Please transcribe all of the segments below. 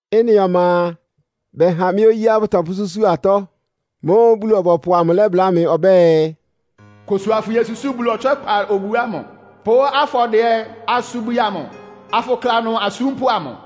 Ɩ́nɩ ɔma a, bɛha mɩ́ oyíá bʋtɔpʋ́súsu atɔ́. Mʋ́ʋ́ Bulu-ɔbɔpʋ amʋ lɛ́bláa mɩ ɔbɛ́ɛ, “Kʋsʋ afʋyosusúu Bulu ɔtswɛ́kpa obu ámʋ pʋ́ afɔdɩɛ-asubwi amʋ, afʋkla ɩnʋ asúmpʋ́ amʋ.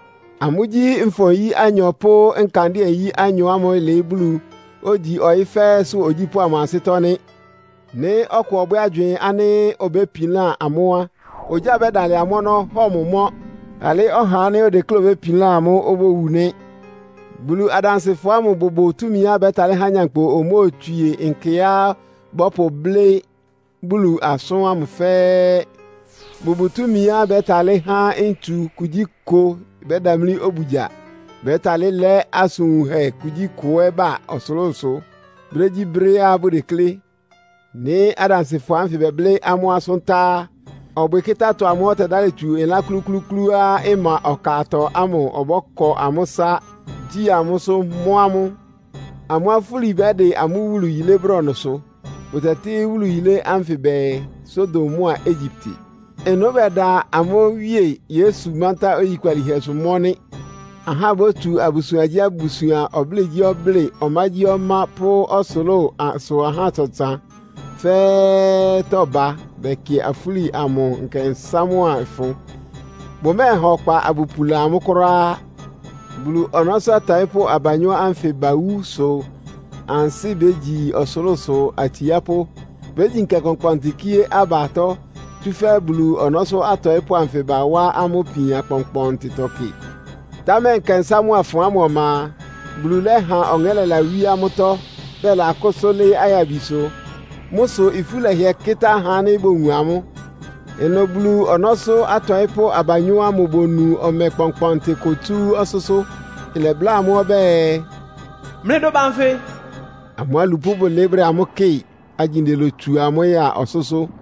Amʋ́gyí nfɔ-nyí anyɔ pʋ́ ɔkandɩ́ɛ-nyí anyɔ ámʋ́ʋ́ ɩlɩɩ́ Bulu, ogyi ɔyɩ́ fɛ́ɛ́sʋ́ ogyípʋ́ amʋ ansɩ́tɔ́ nɩ́. Nɩ́ ɔkʋ ɔbwɛ́ agywɩɩn ánɩ́ obépilán amʋ́ á, ogyá bɛ́dalɩ amʋ́ ɔnɔ́, hɔ mʋ mɔ́. Alɩ́ ɔhá ánɩ́ odekléá obépilán amʋ́ obówu nɩ́. Bulu adansɩfɔ ámʋ bʋbʋ túmiá bɛ́talɩ́ há nyankpʋ omóotswie nkɛá bɔ́pʋblɩ́ Bulu asʋ́n ámʋ fɛ́ɛ́. Bʋbʋ túmiá bɛ́talɩ́ há ntsu kugyíkʋ bɛ́damlí obugya. Bɛ́talɩ́ lɛ́ asʋn wunhɛ kugyíkʋ ɛ́ ba ɔsʋlʋ́sʋ brégyíbrɛ́á bʋdeklé. Nɩ́ adansɩfɔ ánfɩ bɛblɩ́ amʋ́ asʋ́n tá á, ɔbwɩkɩ́tá-atɔ amʋ́ʋ́ ɔtɛdálɩ tsu ɩlán klúklúúklúá ɩma ɔkatɔ ámʋ ɔbɔ́kɔ amʋ́ ɩsá, gyí amʋ́sʋ́, mɔ́ amʋ́. Amʋ́ afúli bɛ́dɩ amʋ́ wúlu yilé brɔnʋsʋ. Bʋtɛtɩ́ wúlu yilé ánfɩ bɛɛ, “Sodom mʋ́a Egyipte.” Ɩnʋ bɛda amʋ́ Wíe Yesu mántá oyikpalíhɛsʋ, mɔ́ nɩ́. Ahá bótsu abusuangyíabusuan, ɔblɩ́ɩgyíɔblɩ́ɩ, ɔmágyíɔmá pʋ́ ɔsʋlʋ́sʋ ahá ɔtsan-ɔtsan fɛ́ɛ́tɔ́ ba bɛkɩ afúli amʋ nkɛnsá mʋ́a ɩfʋn. Bʋmɛ́ɛha ɔkpa abʋpula amʋ́ kʋ́ráá. Bulu ɔnɔ́sʋ́ atɔɩ́pʋ́ abanyɔ́ ánfɩ bawú sʋ ansɩ́ bégyi ɔsʋlʋ́sʋ atsiápʋ́. Bégyi nkɛ kpɔnkpɔntɩ, kíé aba atɔ́, tsúfɛ́ Bulu ɔnɔ́sʋ́ atɔɩ́pʋ́ anfɩ bawá amʋ́ ipian kpɔnkpɔntɩtɔ kɩ. Támɛ nkɛnsá mʋ́a ɩfʋn ámʋ ɔma a, Bulu lɛ́ha ɔŋɛ́ lɛlawíé amʋ́tɔ́, bɛlakʋsʋ́ lɩ́ɩ́ ayabisʋ. Mʋ́ sʋ ifú lɛhɩɛ kɩ́tá ahá ánɩ́ bowun amʋ́. Ɩnʋ Bulu ɔnɔ́sʋ́ atɔɩ́pʋ́ abanyɔ́ ámʋ bonu ɔmɛ kpɔnkpɔntɩ kʋ tsú ɔsʋ́sʋ́, ɩlɛbláa amʋ́ ɔbɛ́ɛ, “Mlɩdʋ ba nfɩ!” Amʋ́ alupʋ́ ámʋ bʋlɩɩ́ bʋdɛ amʋ́ kɩ́ɩ, agyinde lotsu amʋ́ ya ɔsʋ́sʋ́.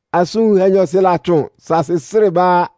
Asʋn wunhɛ nyɔɔsɩ latsʋn, saasɩ srɩ́ ɩbá á.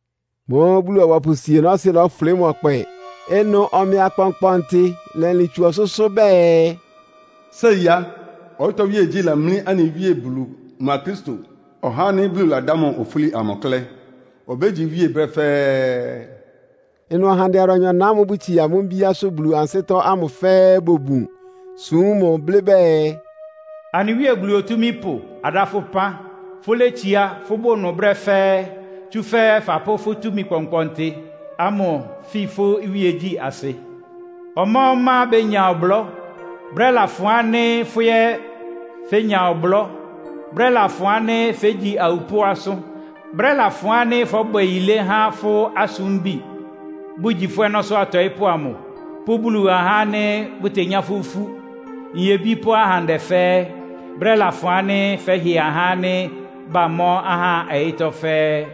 Mʋ́ʋ́ Bulu-ɔbɔpʋ osienɔ́sɩ́ lɔ́fʋlɩ́ mʋ ɔkpɛ. Ɩnʋ ɔmɛ akpɔnkpɔntɩ lɛlɩn tsu ɔsʋ́sʋ́ bɛɛ, “Séi á, ɔyɩ́tɔ́ iwíegyí lamlí anɩ Wíe Bulu mʋa Kristo, (ɔhá ánɩ́ Bulu ladá mʋ ofúli amʋ) klɛ́. Obégyi iwíe brɛ́ fɛ́ɛ́!” Ɩnʋ ahandɛ adʋanyɔ-na ámʋ́ʋ́ bʋtsie amʋ́ mbíásʋ́ Bulu ansɩ́tɔ́ ámʋ fɛ́ɛ́ bobun, súm mʋ, blɩ́ bɛɛ, “Anɩ Wíe Bulu Otúmípʋ, adá fʋ́ ɩpán. Fʋ́létsiá, fʋ́bʋ ɩnʋ brɛ́ fɛ́ɛ́. Tsúfɛ́ fapʋ́ fʋ́ túmi kpɔnkpɔntɩ ámʋ fi fʋ́ iwíegyí asɩ! Ɔmá-ɔmá benya ɔblɔ́, brɛ́ lafʋn ánɩ́ fʋ́ ɛ́ fénya ɔblɔ́. Brɛ́ lafʋn ánɩ́ fégyi awupʋ́ asʋ́n. Brɛ́ lafʋn ánɩ́ fɔ́bwɛ yilé há fʋ́ asúmbi, bʋgyí fʋ́ ɔnɔ́sʋ́ atɔɩ́pʋ́ amʋ, pʋ́ Bulu ahá ánɩ́ bʋtenyá fʋ́ ifú, nyebí pʋ́ ahandɛ fɛ́ɛ́. Brɛ́ lafʋn ánɩ́ fɛ́hɩ ahá ánɩ́ bamɔ́ ahá ɔyɩ́tɔ́ fɛ́ɛ́.”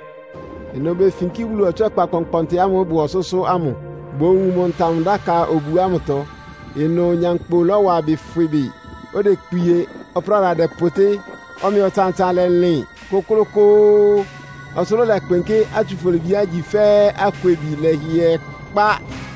Ɩnʋ befinkí Bulu ɔtswɛ́kpa kpɔnkpɔntɩ ámʋ́ʋ́ ɩbʋ ɔsʋ́sʋ́ ámʋ, bowun mʋ Ntam-dáka obu ámʋtɔ. Ɩnʋ nyankpʋ lɔ́wa ɩbɩ fwɩ bɩ. Odekpie, ɔpráda dɛpʋtɩ́, ɔmɛ ɔtsan-ɔtsan lɛlɩn kʋ́klʋ́kʋ́ʋ́, ɔsʋlʋ́ʋ lɛkpɩnkɩ́; átsufolibiá igyi fɛ́ akwebi lɛ́hɩɛ kpá.